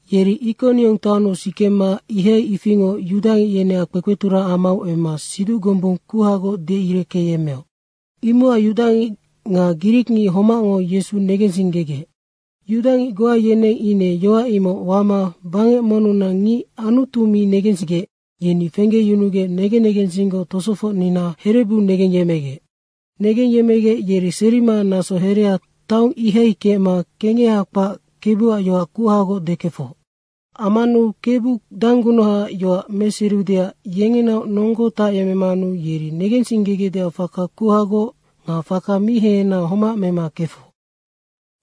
Yeri Ikoniong taonnu sikema ihai ifingoc yudangic yeneac kpekpeturang amau emma siduc gombung kuhagoc deireckeyemmeoc. Imocac yudangic nga grikngic homacngo Yesu negensinggegec. Yudangic goa yeneng ine yoac imoc wama bangec monnunac ngic Anutu mi negensigec, yeni fenggeyunugec negen negensinggoc tosofocnina herebu negengyemmegec. Negengyemmegec yeri serima naso herea taong ihai kecma kengeha kpac Kebuac yoac kuhagoc dekefoc. Ammanu Kebu danggunuhaac yoac meseriudeac yengenaoc nonggo tacyecmemanu yeri negensinggegecdeac faka kuhagoc nga faka mi hehena homac mema kefoc.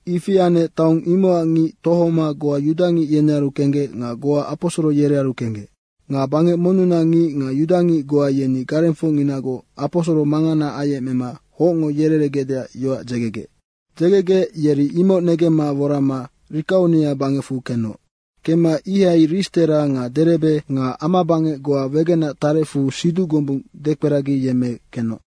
Ifi anec taong imocac ngic tohoma goa yudangic yenearu kenggec nga goa aposoro yerearu kenggec. Nga bangec monnunac ngic nga yudangic goa yeni garengfocnginagoc aposoro mangana ayecmema hocngo yereregecdeac yoac dzegegec. Dzegegec yeri imoc negemma worama Rikaonia bangecfu kenoc. Kemma ihai Ristera nga Derebe nga amabangec goa wegenac tarecfu siduc gombung dekperagiyemme kenoc.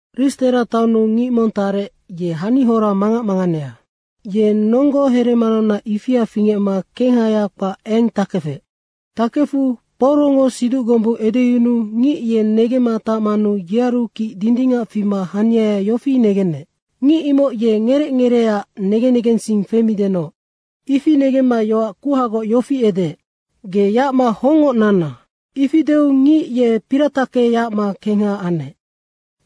Ristera taonnu ngic mong tarec, ye hanihora mangac manganea. Ye nonggo heremanaunac ifia fingecma kenghaya kpac eng takefec. Tackefu Paurongo siduc gombung edeyunuu ngic ye negemma tacmanu yearu kic dindingac fima haniaya yofi negenec, “Ngic imoc ye ngerec ngereeac negen negensing femidenoc.” Ifi negemma yoac kuhagoc yofi edeec, “Ge yacma hongngoc nanna.” ifi deu ngic ye poratacke yacma kengha anec.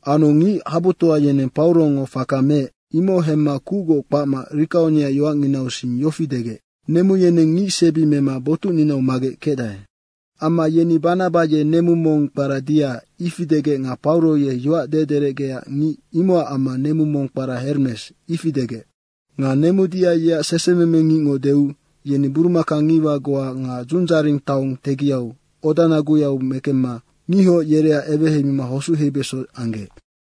Anu ngic habutoa yeneng Paurongo faka meec, imoc hemma kucgoc kpacma Rikaonia yoacnginau sing yofi degec, “Nemu yeneng ngicsebi mema botucninau magec kecdae.” Amma yeni Banaba ye nemu mong kpara Dia, ifi degec nga Pauro ye yoac dederecgeac ngic, imocac amma nemu mong kpara Hermes, ifi degec. Nga nemu Dia yeac sesememengicngo deu yeni burumaka ngiwa goa nga dzundzaring taong tegiau odanaguyau mekemema ngihoc yereac eweheima hosuc heibeso anggec.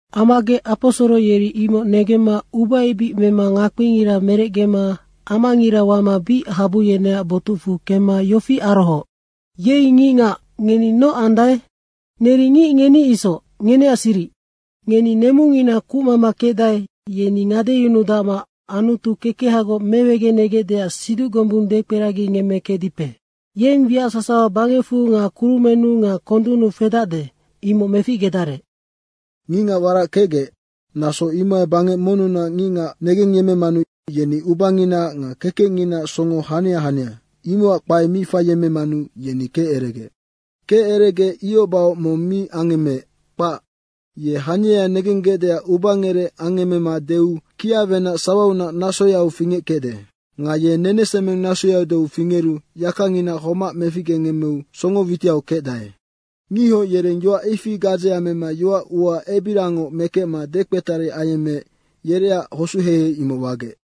Ammagec aposoro yeri imoc negemma ubaebic mema ngakpingira merecgema amangira wama bic habu yeneac botucfu kemma yofi arohooc, “Yei, ngicngac ngeni noc andae? Neri ngic ngeni isoc, ngeneac siric. Ngeni nemungina kucmama kecdae, yeni ngadeyunuma Anutu kekehagoc mewegenegecdeac siduc gombung dekperagingemmekecdipe. Yeng wiac sasawa bangecfu nga kurumennu nga kondunnu fedacde, imoc meficgedarec. Ngicngac warac kecgec, naso imohai bangec monnunac ngicngac negengyemmemanu yeni ubanginaac nga kekecnginaac songo hania hania, imocac kpaea mi faiyemmemanu yeni keceregec. Keceregec ihoc bahoc mong mi angemmeec, kpac. Ye haniaya negenggecdeac ubangerec angemmema deu kiawenac sawaunac nasoyau fingeckecde. Nga ye nenesemeng nasoyau deu fingeru yakangina homac meficgengemmeu songo witiau kecdae.” Ngihoc yereng yoac ifi gadzea mema yoac ua ebiriangoc mekecma dekpetari ayemmeec yereac hosucheihei imoc wagec.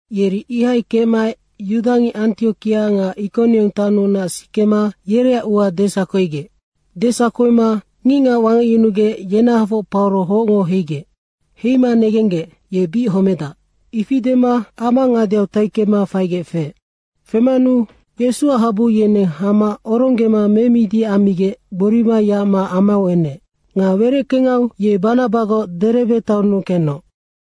Yeri ihai kecmaec yudangic Antiokia nga Ikoniong taonnunac sikema yereac ua desakoigec. Desakoima ngicngac wangecyunugec, yenahafoc Pauro hocngo heigec. Heima negenggec, “Ye bic homedac.” ifi dema ama ngadeau taikemma faigec feec. Femanu Yesuac habu yeneng hama oronggema memidi ammigec gborima yacma amau enec. Nga wereckengau ye Banabagoc Derebe taonnu kenoc.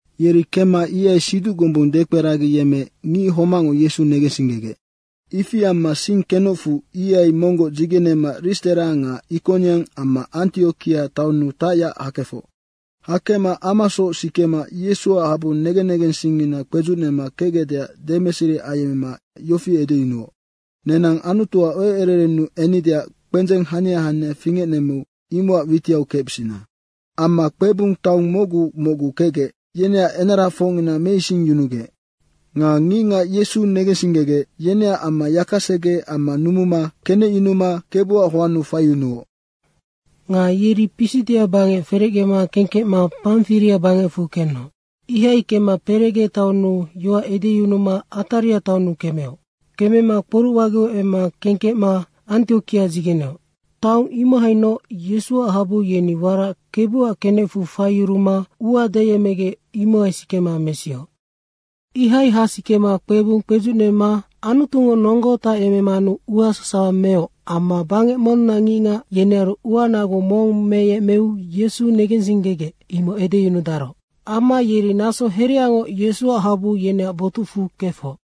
Yeri kemma ihai siduc gombung dekperagiyemmeec ngic homacngo Yesu negensinggegec. Ifi amma sing kenocfu, ihai monggoc dzigenema Ristera nga Ikoniong amma Antiokia taonnu tacyac hakefoc. Hakecma amasoc sikema Yesuac habu negen negensingina kpedzucnema kecgecdeac demeseri ayemmema yofi edeyunuoc, “Nenang Anutuac eucererennu ennideac kpendzeng hania hania fingecnemmeu imocac witiau kecbisina.” Amma kpebung taong mocgu mocgu kecgec, yeneac enarafocngina meisingyunugec. Nga ngicngac Yesu negensinggegec, yeneac amma yakasege amma numuma kenecyunuma Kebuac hoannu faiyunuoc. Nga yeri Pisidia bangec ferecgema kengkecma Pamfiria bangecfu kenoc. Ihai kemma Perege taonnu yoac edeyunuma Ataria taonnu kemeoc. Kemema kporucwageu emma kengkecma Antiokia dzigeneoc. Taong imohainoc Yesuac habu yeni warac Kebuac kenecfu faiyuruma ua deyecmegec, imohai sikema mesioc. Ihai hasikema kpebung kpedzucyunuma Anutungo nonggo tayecmemanu ua sasawa meoc amma bangec monnunac ngicngac, yenearu ua nagu mong meyecmeu Yesu negensinggegec, imoc edeyunudaroc. Amma yeri naso hereangoc Yesuac habu yeneac botucfu kefoc.